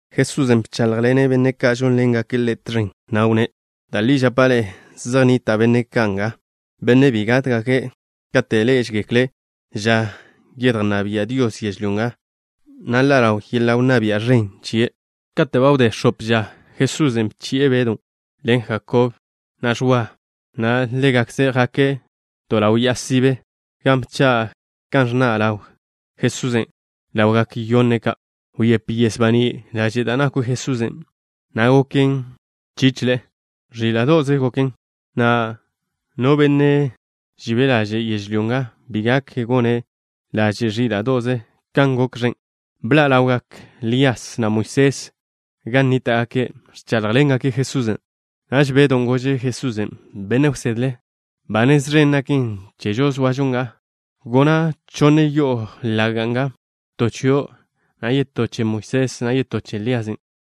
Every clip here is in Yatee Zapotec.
Jesusen' bcháḻjḻene' benne' ka' žónḻengake' Ḻe' tẕen, na' wnné': —Da' li žapa' ḻe'e, zej nnita' benne' ka' nga, benne' bi gátgake' kate' ḻé'ežegekle' ža yedjnná bia' Dios yežlyó nga, na' ḻa' ḻaw yeḻa' wnná bia' ẕen chie'. Kate' ba wdé x̱ope ža, Jesusen' bchi'e Bedw ḻen Jakob, na' Ẕwa, na' ḻégakze' jake' to ḻaw ya'a sibe, gan bcha' kan ẕnna' ḻaw Jesusen' ḻawgak yonne' ka'. Wyép yes baní' laže' da' nakw Jesusen', na' goken chícheḻe'e. Ẕíla'do'ze goken, na' no benne' žibe' laže' yežlyó nga, bi gak gone' laže' ẕíla'do'ze kan gok ẕen'. Bḻa' ḻawgak Lías, na' Moisés gan nníta'gake', ẕcháḻjḻengake' Jesusen'. Naž Bedon' gože' Jesusen': —Benne' wsedle, ba nez ẕen naken chežo zoažo nga. Gona' chonne yo'o laga' nga, to chio', na' yetó che Moisés, na' yetó che Lías.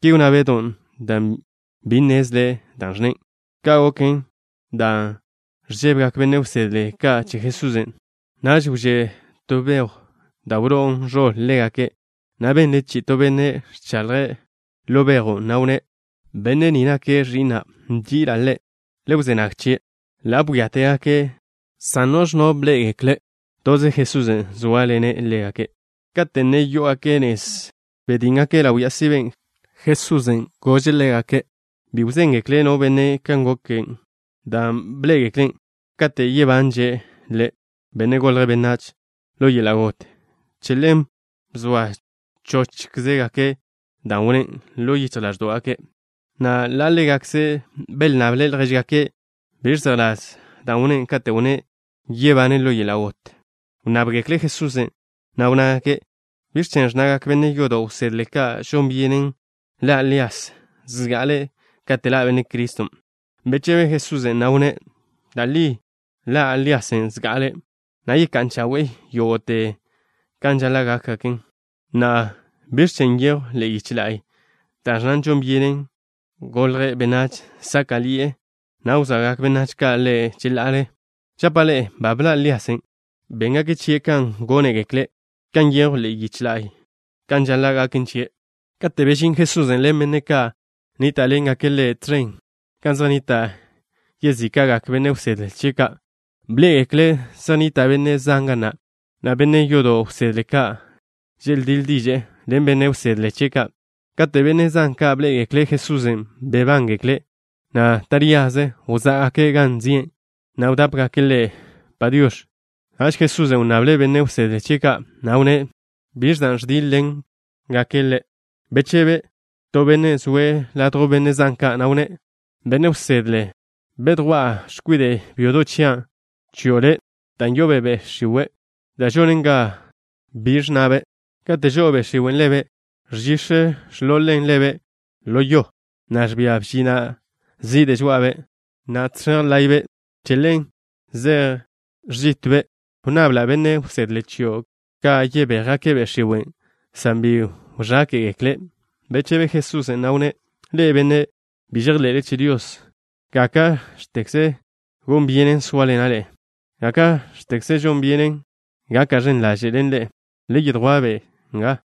Ki wnná Bedon' dan' bi nnezle' dan' ẕnne'. Ka' goken dan' ẕžébegak benne' wsedle ka' che Jesusen'. Naž wžé' to bejw da' wló'on ẕoḻ ḻégake', na' benle chi'i to benne' ẕchaḻje' ḻo bejw na', na' wnné': —Benne' ni nake' Ẕi'na'. Nži'ila' Ḻe'. Le wzé nag chie'. Ḻa' bwíategake' san biž no benne' bḻé'egekle'. Toze Jesusen' zóaḻene' ḻégake'. Kate' ne yó'ogake' nez, žétjgake' ḻaw ya'a siben', Jesusen' bchi'le' ḻégake' bi wzéngekle' no benne' kan gok dan' bḻé'egeklen', kate' yebanže' Ḻe', Benne' Golje' Benách, ḻo yeḻa' got. Che ḻen bzoa chóchzegake' dan' wnné' ḻo yichj ḻáẕdo'gake', na' ḻa' ḻégakze' belnnable' ljéžgake' biẕ zejḻás dan' wnné' kate' wnné' yebane' ḻo yeḻa' got. Wnnábgekle' Jesusen', na' wnnágake': —¿Biẕ chen' ẕnnagak benne' yodo' wsedle ka' žon byenen ḻa' Lías zga'ale' kate' ḻa' Benne' Criston'? Bechebe Jesusen', na' wnné': —Da' li ḻa' Líasen' zga'ale', na' yecá'n chawe'e yógo'te kan žaḻa' gákgaken. Na'a, ¿biẕ chen' nyejw ḻe'e yiche la'y da' ẕnna žon byenen Benne' Golje' Benách sáka'ḻi'e, na' wzoagak benách ka' Ḻe' cheḻa'ale? Žapa' ḻe'e: ba bḻa' Líasen', na' béngake' chie' kan gónegekle', kan nyejw ḻe'e yiche la'y kan žaḻa' gaken chie'. Kate' bežín Jesusen' ḻen benne' ka' nníta'ḻengake' Ḻe' tẕen gan zej nnita' yezíka'gak benne' wsedle chie' ka', bḻé'egekle' zej nnita' benne' zan ga na', na' benne' yodo' wsedle ka' želdíḻ diže'e ḻen benne' wsedle chie' ka'. Kate' benne' zan ka' bḻé'egekle' Jesusen', bebángekle', na' taríaze wzá'gake' gan zi'e, na' wdápegake' Ḻe': “Padiox̱.” Naž Jesusen' wnnable' benne' wsedle chie' ka', na' wnné': —¿Biẕ dan' ẕdíḻ-ḻenle ḻégake'? Bechebe to benne' zoe' ladjw benne' zan ka', na' wnné': —Benne' wsedle, bedjwá'a x̱kwide' byodo' chia' chio' Le', dan' yo'obe' be' x̱iwe' da' žonen ga bi ẕnnabe'. Kate' žo'o be' x̱iwen' ḻebe', ẕžix̱ ẕḻolen ḻebe' ḻo yo, na' ẕbia bžina' zide' žoa'abe', na' žẕej láye'be'. Che ḻen zej ẕžitbe'. Wnnabla' benne' wsedle chio' ka' yebéjgake' be' x̱iwen', san bi wẕáke'gekle'. Bechebe Jesusen', na' wnné': —Ḻe'e, benne' bi žejḻe'le che Dios. ¿Gáka'x̱tekze gon byenen sóaḻena' ḻe'e? ¿Gáka'x̱tekze gon byenen gaka' ẕen ḻaže' ḻen ḻe'e? Le yedjwá'-be' chia'.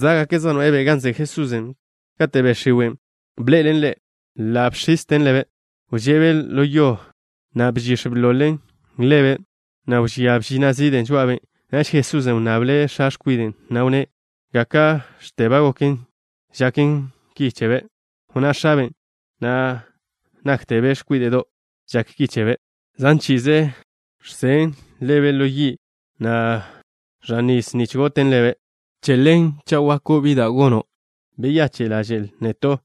Zá'gake' zej noe'e-be' gan zoa Jesusen'. Kate' be' x̱iwen' bḻe'elen Ḻe', ḻa' bx̱izten ḻebe'. Wže'be' ḻo yo, na' bžix̱ bḻolen ḻebe', na' wžía bžina' zide' žoa'abe'. Naž Jesusen' wnnable' x̱a x̱kwiden', na' wnné': —¿Gáka'x̱te ba goken žaken ki chebe'? Wnná x̱aben': —Na' náktebe' x̱kwíde'do' žak ki chebe'. Zan chi'i ẕžen' ḻebe' ḻo yi', na' ẕan nis nich goten ḻebe'. Che ḻen, cha' žako' late', beyache' ḻaže'l neto',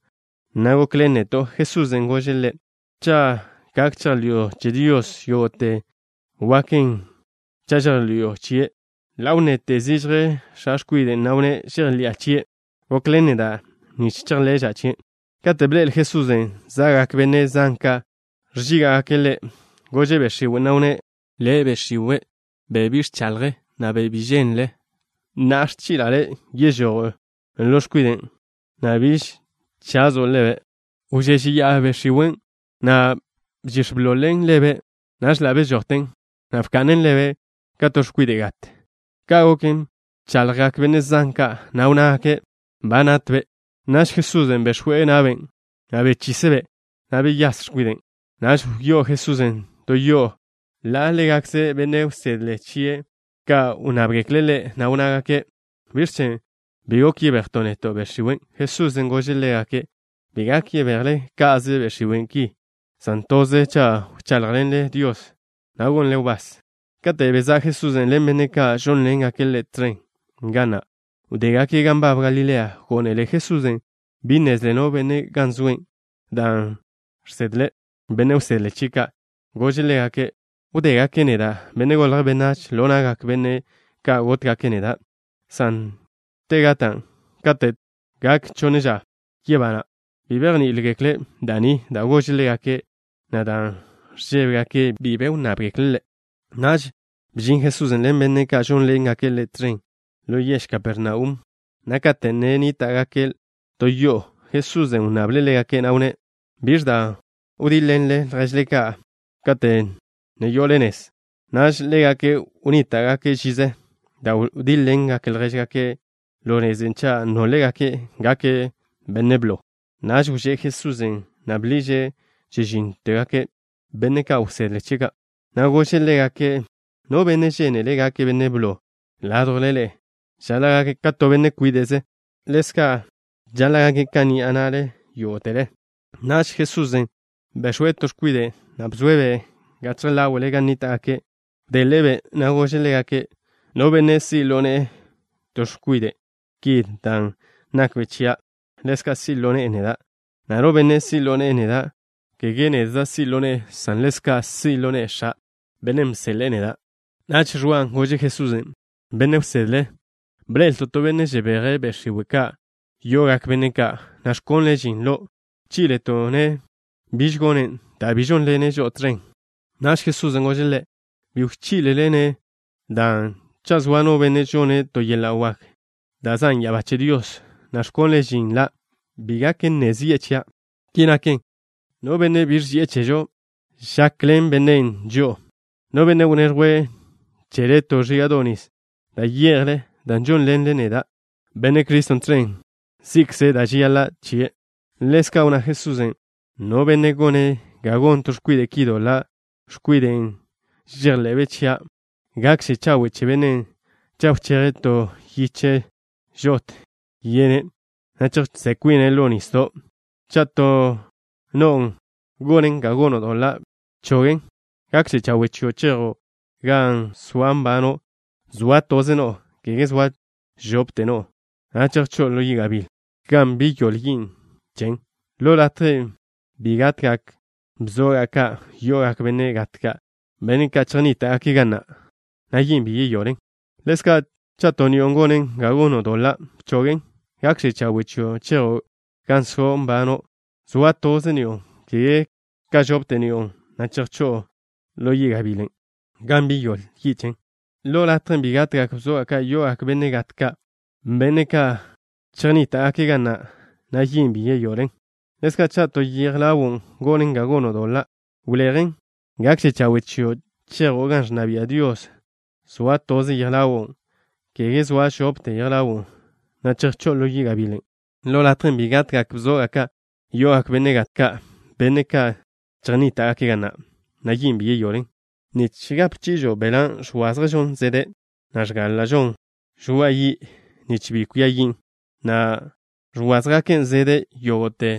na' gokḻen neto'. Jesusen' gože' ḻe': —Cha' gak chejḻi'o che Dios, yógo'te waken cha' chejḻi'o chie'. Ḻa' wnnete zižje x̱a x̱kwiden', na' wnné': —Žejḻi'a chie'. Gokḻen neda' nich chejḻe'ža' chie'. Kate' bḻe'el Jesusen' za'gak benne' zan ka', ẕchígake' Ḻe', gože' be' x̱iwen', na' wnné': —Le', be' x̱iwe', be' žonen ga bi ẕnnagak, na' bi žéngekle benách ka', na'a ẕchi'la' le' yežojo' ḻo x̱kwiden', na' biž chazo' ḻebe'. Wžéžeya'a be' x̱iwen', na' bžix̱ bḻol-ḻe'en ḻebe'. Naž ḻa' bežojten, na' bka'nen ḻebe' ka to x̱kwide' gat. Ka' goken, bchaḻjgak benne' zan ka', na' wnnágake': —Ba natbe'. Naž Jesusen' bex̱we' na'be', na' bechise'-be', na' beyás x̱kwiden'. Naž wyó'o Jesusen' to yo'o, na' ḻa' ḻégakze benne' wsedle chie' ka' wnnábgekle' Ḻe', na' wnnágake': —¿Biẕ chen' bi gok yebejto' neto' be' x̱iwen'? Jesusen' gože' ḻégake': —Bi gak yebejle ka'ze be' x̱iwe' ki, san toze cha' wcháḻjḻenle Dios, na' gonle wbás. Kate' bezá' Jesusen' ḻen benne' ka' žónḻengake' Ḻe' tẕen ga na', wdégake' gan nbab Galilea. Gónele Jesusen' bi nnezle no benne' gan zoe', dan' žsedle' benne' wsedle chie' ka'. Gože' ḻégake': —Wdégake' neda', Benne' Golje' Benách, ḻo na'gak benne' ka' gótgake' neda', san te gata', kate' tegak chonne ža, yebana'. Bi bejní'igekle' da' ni da' gože' ḻégake', na' dan' ẕžébegake', bi be wnnábgekle' Ḻe'. Naž bžin Jesusen' ḻen benne' ka' žónḻengake' Ḻe' tẕen ḻo yež Kapernaum, na' kate' ne nníta'gake' to yo'o, Jesusen' wnnable' ḻégake', na' wnné': —¿Biẕ dan' wdíḻ-ḻenle lježle kate' ne yo'ole nez? Naž ḻégake' wnníta'gake' žize dan' wdíḻ-ḻengake' ljéžgake' ḻo nezen' cha' nólgake' gake' benne' blo. Naž wžé' Jesusen', na' bḻiže' chežínnote benne' wsedle chie' ka', na' gože' ḻégake': —No benne' žénele' gake' benne' blo ládjwle ḻe'e žaḻa' gake' ka to benne' kwíde'ze, na' ḻezka' žaḻa' gake' ka ni'a na'le yógo'tele. Naž Jesusen' bex̱we' to x̱kwide', na' bzoe'-be' gachje ḻáwe'le gan nníta'gake'. Wdeḻe'e-be', na' gože' ḻégake': —No benne' si' ḻo ne'e to x̱kwide' ki dan' nakbe' chia', ḻezka' si' ḻo ne'e neda', na' no benne' si' ḻo ne'e neda', kege nedza' si' ḻo ne'e, san ḻezka' si' ḻo ne'e X̱a', Bennen' bseḻe'e neda'. Naž Ẕwa gože' Jesusen': —Benne' wsedle, bḻe'elto' to benne' žebeje' be' x̱iwe' ka' yo'ogak benne' ka', na' ẕkonle' žin lo'. Bchi'leto'-ne' biž gonen', dan' bi žónḻene' žo'o tẕen. Naž Jesusen' gože' ḻe': —Bi wchí'lele-ne', dan' cha' zoa no benne' žone' to yeḻa' wak da' zan' ya'abá che Dios, na' ẕkonle' žin la', bi gak nne zi'e chia'. Ki naken, no benne' bi ẕži'e chežo, žakḻen bennen' žo'o. No benne' wneẕjwe' chele to ẕíga'do' nis da' ye'jle dan' žónḻenle neda', Benne' Criston', tẕen, si'kze' da' žeyaḻa' chie'. Ḻezka' wnná Jesusen': —No benne' gone' ga gon to x̱kwide' ki doḻa', x̱kwiden' žejḻe'be' chia', gakže chawe' che bennen' cha' wcheje' to yiche žotw yene', na' chejžó'n kwine' ḻo nisdo'. Cha' to no'o gonen ga gono' doḻa', bchogen'. Gakže chawe' chio' chejo' gan so' nbano' zoa toze no'o, kege zoa chope no'o, na' chejchó'o ḻo yi' gabíl, gan bi yoḻe yi' chen. Ḻo latjen' bi gatgak bzoga' ka' yo'ogak benne' gat ka', benne' ka' chejnníta'gake' ga na', na' yin' bi yoḻen. Ḻezka', cha' to ni'o gonen ga gono' doḻa', bchogen'. Gakže chawe' chio', chejo' gan so' nbano' zoa toze ni'o, kege zoa chope ni'o, na' chejchó'o ḻo yi' gabilen', gan bi yoḻe yi' chen. Ḻo latjen' bi gatgak bzoga' ka' yo'ogak benne' gat ka', benne' ka' chejnníta'gake' ga na', na' yin' bi yoḻen. Ḻezka' cha' to yej ḻawo' gonen ga gono' doḻa', wlejen. Gakže chawe' chio' chejo' gan ẕnna bia' Dios zoa toze yej ḻawo', kege zoa chope yej ḻawo', na' chejchó'o ḻo yi' gabilen'. Ḻo latjen' bi gatgak bzoga' ka' yo'ogak benne' gat ka', benne' ka' chejnníta'gake' ga na', na' yin' bi yoḻen. ’Nich gape chi'ižo beḻa' ẕwázježon zede', na' ẕgála'žon žoa'a yi', nich bi kwia yin', na' ẕwázjegake' zede' yógo'te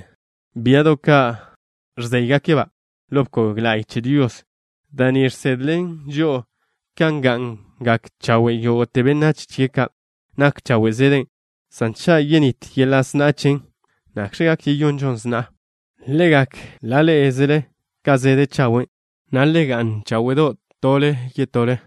biado' ka' ẕzéygake'-ba' ḻo bkog la'y che Dios. Da' ni žsedlen žo'o kan ga'ngak chawe' yógo'te benách chie' ka'. Nak chawe' zede', san cha' yenít yeḻa' sna'a chen, ¿nakx̱ gak yeyonžon sna'a? Le gak ḻa' ḻé'ezele ka zede' chawe', na' bga'n cháwe'do' tole ḻen yetole.